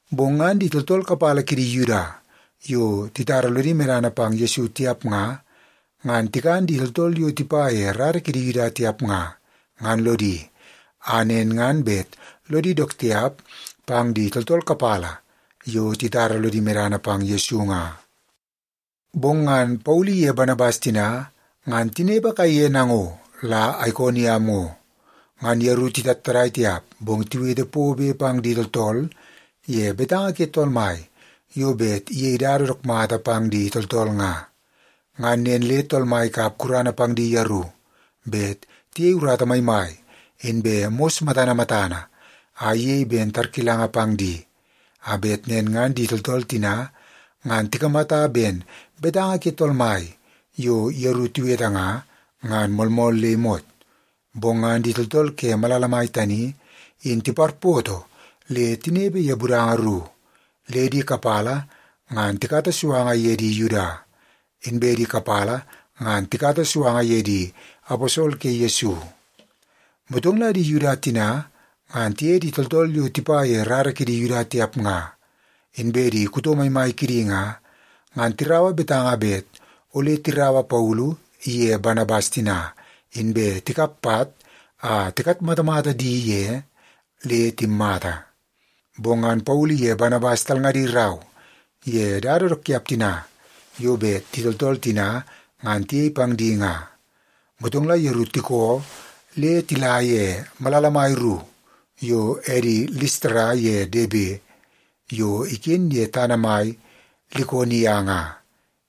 Bong ngan di tooltool kapala kidi Yuda yo titara lodi medana pang Yesu tiap nga, ngan tikan di tooltool yo tipa ye rara kidi Yuda tiap nga, ngan lodi, a nen ngan bet lodi dook tiap pang di tooltool kapala yo titara lodi medana pang Yesu nga. Bong ngan Paulu iye Banabas tina ngan tinepe kaiye nango la Aikoniam ngo. Ngan yeru titattadai tiap, bong tiwete pobe pang di tooltool ye betanga ke Tool Mai yo bet iyei dada dook mata pang di tooltool nga. Ngan nen le Tool Mai ikap gurana pang di yeru bet tiyei urata maimai, inbe mos matana matana a iyei ben tarkilanga pang di, a bet nen ngan di tooltool tina ngan tikamata ben betanga ke Tool Mai yo yeru tiwete nga, ngan moolmool le imot. Bong ngan di tooltool ke malala mai tani in tiparpoto le tinepe ye budanga ru. Le di kapala ngan tikata suanga ye di Yuda, inbe kapala ngan la tikata suanga ye di aposol ke Yesu. Motong la di Yuda tina ngan tiye di tooltool yo tipa ye rara kidi Yuda tiap nga, inbe di kuto maimai kidi nga, ngan tiraua betanga bet ole tiraua Paulu iye Banabas tina, inbe tikap pat a tikatmatamata di ye le timmata. Bong ngan Paulu iye Banabas talngadi rau ye dada dook tiap tina yo bet di tooltool tina ngan tiyei pang di nga, motong la yeru tikoo le tila ye malala mai ru yo edi Listara ye Debe, yo iken ye tana mai Likonia nga,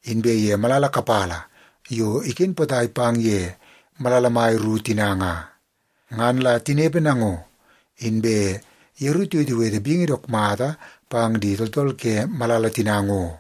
inbe ye malala kapala yo iken potai pang ye malala mai ru tina nga. Ngan la tinepe nango, inbe yeru tiwetewete bingi dook mata pang di tooltool ke malala tina ngo.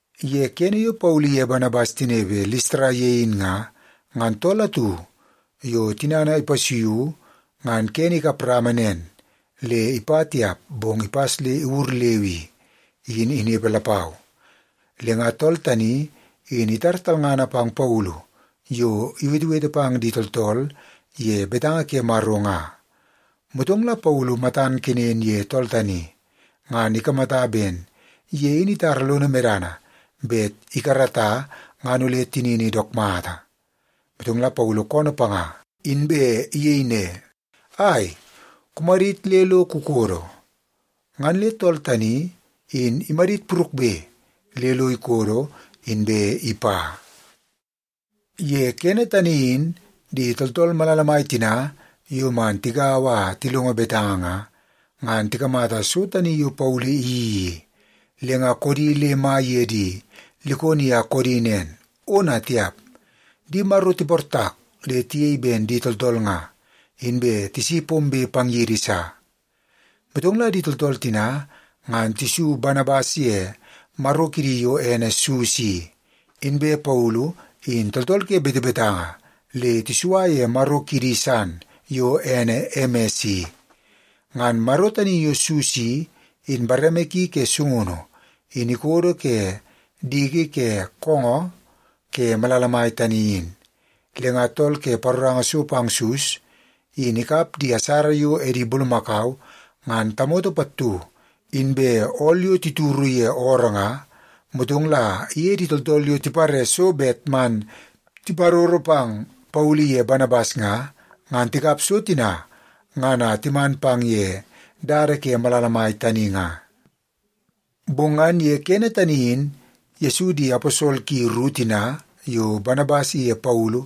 Ye kene yo Paulu iye Banabas tinepe Listara ye in nga, ngan tool atu yo tinana ipasuiu ngan kene ikap rama nen le ipa tiap bong ipas le iwur leu i, in inepe lapau. Le nga tool tani in itar talngana pang Paulu yo iwetewete pang di tooltool ye betanga ke Maro nga. Motong la Paulu matan kenen ye tool tani, ngan ikamata ben ye in itara lono medana bet ikarata ngan ole tinini dook mata. Motong la Paulu koonoo panga, inbe iyei ne, “Ai, kumadit le lo kukodo!” Ngan le tool tani in imadit purukbe le lo ikodo, inbe ipa. Ye kene tani in di tooltool malala mai tina yo man tigaua a tilongo betanga nga, ngan tikamata so tani yo Paulu iyeii i, le nga koodi le mai ye di Likonia koodi nen, “Ona tiap! Di maro tiportak le tiyei ben di tooltool nga, inbe tisi pombe pang yidi sa!” Motong la di tooltool tina ngan tisu Banabas ye maro kidi yo ene Sus i. Inbe Paulu in tooltool ke betebetanga le tisua ye maro kidi san yo ene Emes i. Ngan maro tani yo Sus i, in bareme ki ke sungunu in ikodo ke diki ke koongoo ke malala mai tani in. Le nga tool ke paroranga so pang Sus in ikap di asara yo edi bulumakau ngan tamoto pattu inbe ool yo tituru ye ooroo nga, motong la iye di tooltool yo tipare so bet man tiparoro pang Paulu iye Banabas nga, ngan tikap so tina ngan a timan pang ye dada ke malala mai tani nga. Bong ngan ye kene tani in Yesu di aposol ki ru tina yo Banabas iye Paulu,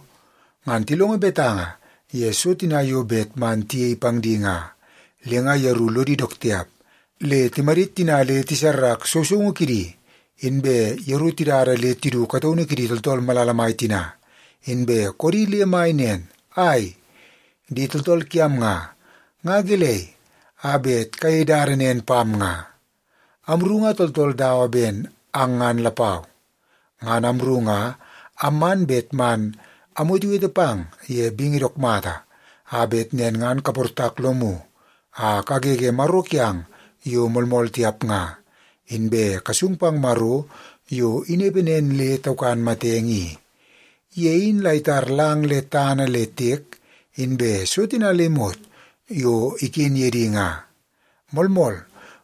ngan tilongo betanga ye so tina yo bet man tiyei pang di nga. Le nga yeru lodi dook tiap le timadit tina le tisarrak sousoungu kidi, inbe yeru tidada le tidu kataunu kidi tooltool malala mai tina, inbe koodi le mai nen, “Ai, di tooltool kiam nga, nga gelei a bet kayei dada nen pam nga? Amru nga tooltool dawa ben ang ngan lapau. Ngan amru nga amman bet man amwetewete pang ye bingi dook mata, a bet nen ngan kaportak lomu a kagege maro kiang yo moolmool tiap nga, inbe kasung pang Maro yo inepe nen le taukan matenge i. Ye in la itar lang le tana le tiek, inbe so tina le imot yo iken ye di nga. Moolmool,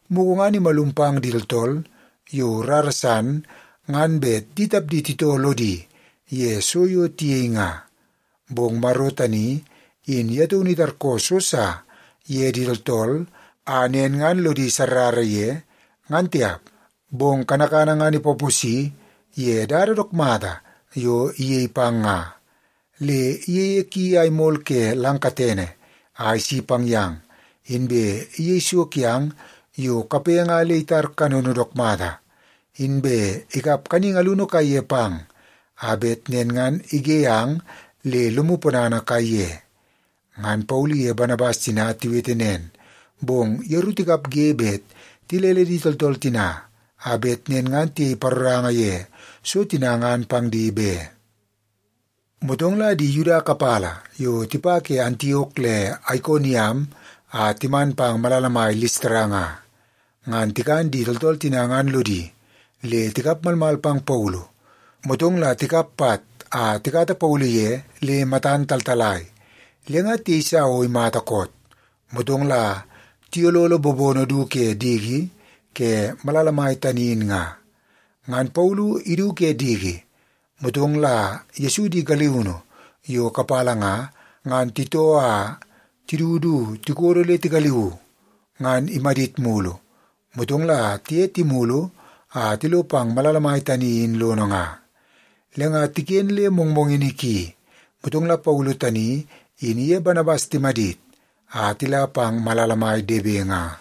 mugu ngan imalum pang di tooltool yo rara san ngan bet di tapdi titoo lodi ye so yo tiyei nga. Bong Maro tani in ye taunu itarkoo so sa ye di tooltool a nen ngan lodi sarrara ye, ngan tiap. Bong kanakana ngan ipaposi ye dada dook mata yo iyei pang nga. Le iyeie ki a imol ke lang katene a isi pang yang, inbe iyei so kiang yo kape nga le itar kanono dook mata, inbe ikap kaningi alunu kaiye pang a bet nen ngan ige ang le lomu ponana kaiye.” Ngan Paulu iye Banabas tina tiwete nen, bong yeru tikapge bet tilele di tooltool tina a bet nen ngan tiyei paroranga ye so tina ngan pang di be. Motong la di Yuda kapala yo tipa ke Antiok le Aikoniam a timan pang malala mai Listara nga, ngan tikan di tooltool tina ngan lodi, le tikap malmal pang Paulu. Motong la tikap pat a tikata Paulu ye le matan taltalai, le nga tiyeisa o imata koot, motong la tiyololo bobono du ke diki ke malala mai tani in nga. Ngan Paulu idu ke diki, motong la Yesu di galiunu yo kapala nga, ngan titoo a tidu du tikodo le tigaliuu, ngan imadit mulu, motong la tiye timulu a tilo pang malala mai tani in lono nga. Le nga tiken le mongmongini ki, motong la Paulu tani in iye Banabas timadit a tila pang malala mai Debe nga.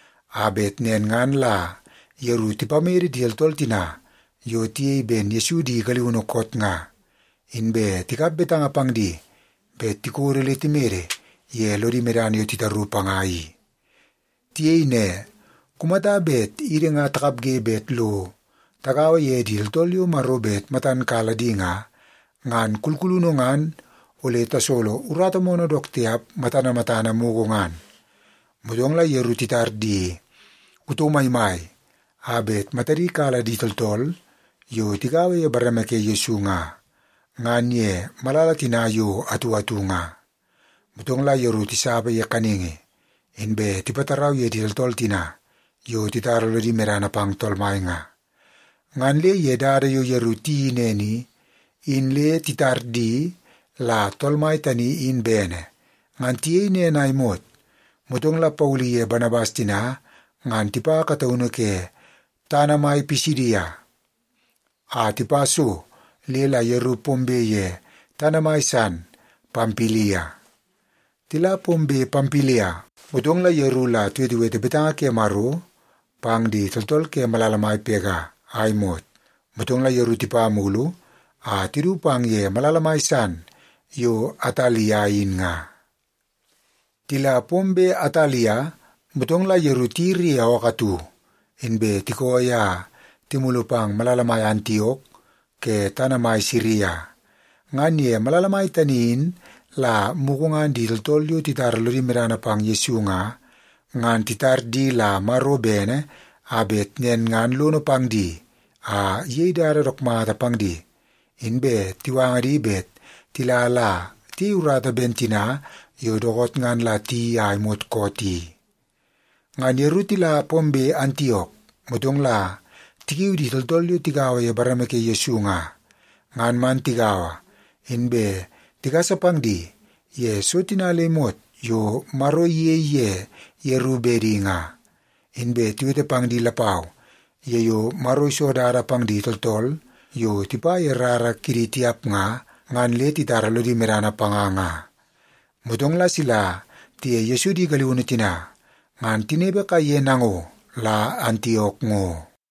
a bet nen ngan la yeru tipamede di tooltool tina yo tiyei ben Yesu di galiunu koot nga, inbe tikap betanga pang di bet tikodo le timede ye lodi medana yo titaru panga i. Tiyei ne, “Kumata bet idi nga takapge bet lo tagaua ye di tooltool yo Maro bet matan kala di nga, ngan kulkulunu ngan ole tasolo urata moonoo dook tiap matana matana mugu ngan.” Motong la yeru titar di kuto maimai a bet matadi kala di tooltool yo tigaua ye bareme ke Yesu nga, ngan ye malala tina yo atu atu nga. Motong la yeru tisapa ye kaningi inbe tipatarau ye di tooltool tina yo titara lodi medana pang Tool Mai nga. Ngan le ye dada yo yeru tiyeii nen i, in le titar di la Tool Mai tani in bene. Ngan tiyei nen a imot, motong la Paulu iye Banabas tina ngan tipa kataunu ke tana mai Pisidia, a tipa so le la yeru pombe ye tana mai san Pampilia. Tila pombe Pampilia, motong la yeru la tiwetewete betanga ke Maro pang di tooltool ke malala mai Pega a imot. Motong la yeru tipa mulu a tidu pang ye malala mai san yo Atalia in nga. Tila pombe Atalia, motong la yeru tiyiri ye ookoo atu, inbe tikooi a timulu pang malala mai Antiok ke tana mai Siria. Ngan ye malala mai tani in la mugu ngan di tooltool yo titara lodi medana pang Yesu nga, ngan titar di la Maro bene a bet nen ngan lono pang di a iyei dada dook mata pang di, inbe tiwanga di bet tila la tiyei urata ben tina yo dookoot ngan la tiyeii a imot koot i. Ngan yeru tila pombe Antiok, motong la tikiu di tooltool yo tigaua ye bareme ke Yesu nga, ngan man tigaua, inbe tigasa pang di ye so tina le imot yo Maro iyei ye yeru bedi nga. Inbe tiwete pang di lapau ye yo Maro iso dada pang di tooltool yo tipa ye rara kidi tiap nga, ngan le titara lodi medana panga nga. Motong la sila tiye Yesu di galiunu tina ngan tinepe kaiye nango la Antiok ngo.